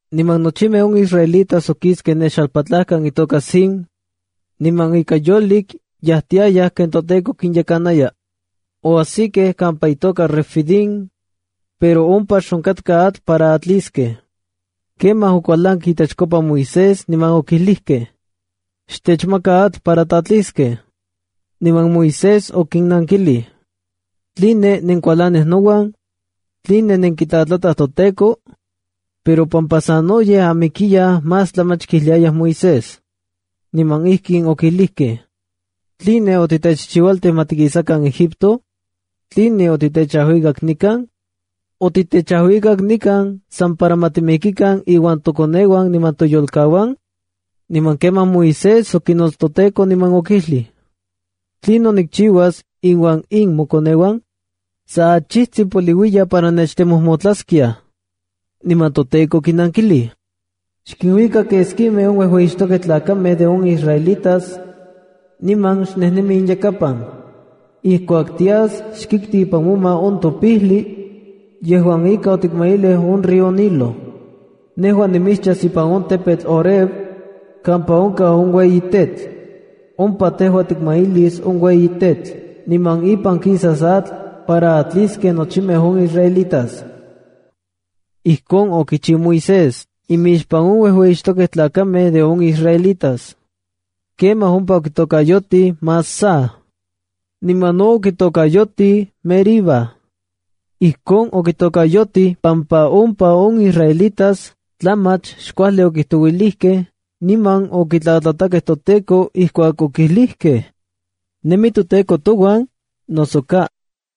Niman nochimej on israelitas okiskej ne xalpatlakan itoka Sin, niman ika yolik yajtiayaj ken toTEKO kinyekanaya. Oajsikej kampa itoka Refidim, pero ompa xonkatka atl para atliskej. Kemaj okualankej itechkopa Moisés niman okijlijkej: —¡Xtechmaka atl para tatliskej! Niman Moisés okinnankilij: —¿Tline nenkualanij nouan? ¿Tline nenkitlatlataj toTEKO? Pero pampa sanoyej amikiyaj más tlamach kijliayaj Moisés. Niman ijkin okijlijkej: —¿Tline otitechchiualtij ma tikisakan Egipto? ¿Tline otitechajuikak nikan? ¿Otitechajuikak nikan san para ma timikikan iuan tokoneuan niman toyolkauan? Niman kemaj Moisés okinots toTEKO niman okijlij: —¿Tlinon nikchiuas inuan in mokoneuan? ¡Sa achijtsin poliuiya para nechtemojmotlaskiaj! Niman toTEKO okinankilij: —Xkinuika keskimej on uejueyixtokej tlakamej de on israelitas, niman xnejnemi inyakapan. Ijkuak tias xkikti ipan moma on topijli yejuan ika otikmailij on río Nilo. Nejua nimitschas ipan on tepetl Horeb kampa onkaj on ueyi tetl. Ompa tejua tikmailis on ueyi tetl, niman ipan kisas atl para atliskej nochimej on israelitas. Ijkon okichiu Moisés imixpan on uejueyixtokej tlakamej de on israelitas. Kemaj ompa okitokayotij Masaha. Niman no okitokayotij Meribab. Ijkon okitokayotij pampa ompa on israelitas tlamach xkuajli okijtouilijkej niman okitlatlatakej toTEKO ijkuak okijlijkej: “¿Nemi toTEKO touan, noso ka?”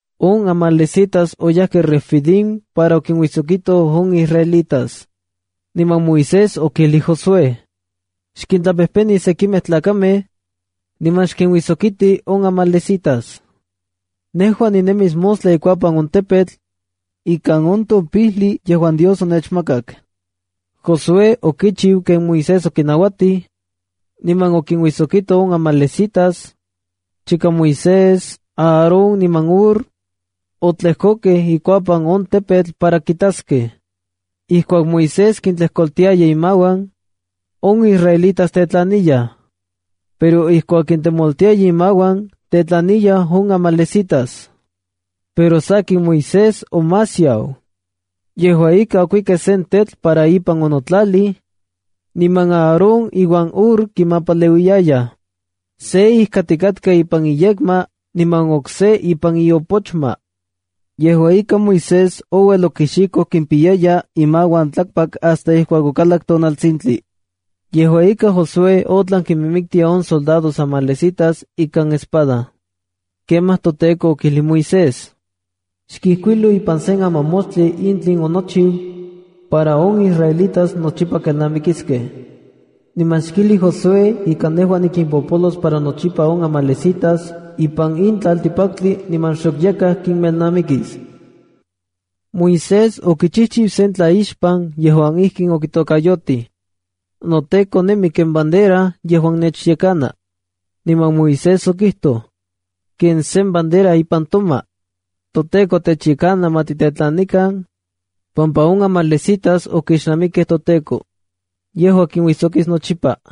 On amalecitas oyajkej Refidim para okinuijsokitoj on israelitas. Niman Moisés okijlij Josué: —Xkintlapejpeni sekimej tlakamej niman xkinuijsokiti on amalecitas. Nejua ninemis mostla ikuapan on tepetl ikan on topijli yejuan Dios onechmakakc. Josué okichiu ken Moisés okinauatij, niman okinuijsokito on amalecitas, chika Moisés, Aarón niman Hur otlejkokej ikuapan on tepetl para kintaskej. Ijkuak Moisés kintlejkoltiaya imauan, on israelitas tetlaniyaj, pero ijkuak kintemoltiaya imauan, tetlaniyaj on amalecitas. Pero sakin, Moisés omasiau. Yejua ika, okuikej sen tetl para ipan onotlalij, niman Aarón iuan Hur kimapaleuiyayaj. Se ijkatikatka ipan iyekma niman okse ipan iopochma. Yejua ika, Moisés ouel okixikoj kimpiyaya imauan tlakpak hasta ijkuak okalak tonaltsintli. Yejua ika, Josué otlan kinmiktia on soldados amalecitas ikan espada. Kemaj toTEKO okijlij Moisés: —Ixkijkuilo ipan sen amamoxtli in tlinon onochiu para on israelitas nochipa kelnamikiskej. Niman xkijli Josué ika nejua nikimpopolos para nochipa on amalecitas ipan in tlaltikpaktli niman xok yakaj kinmelnamikis. Moisés okichijchiu sen tlaixpan yejuan ijkin okitokayotij: “NoTEKO nemi ken Bandera yejuan nechyekana.” Niman Moisés okijtoj: “Ken sen bandera ipan toma, toTEKO techyekana ma titetlanikan pampa on amalecitas okixnamikej toTEKO. Yejua kinuijsokis nochipa.”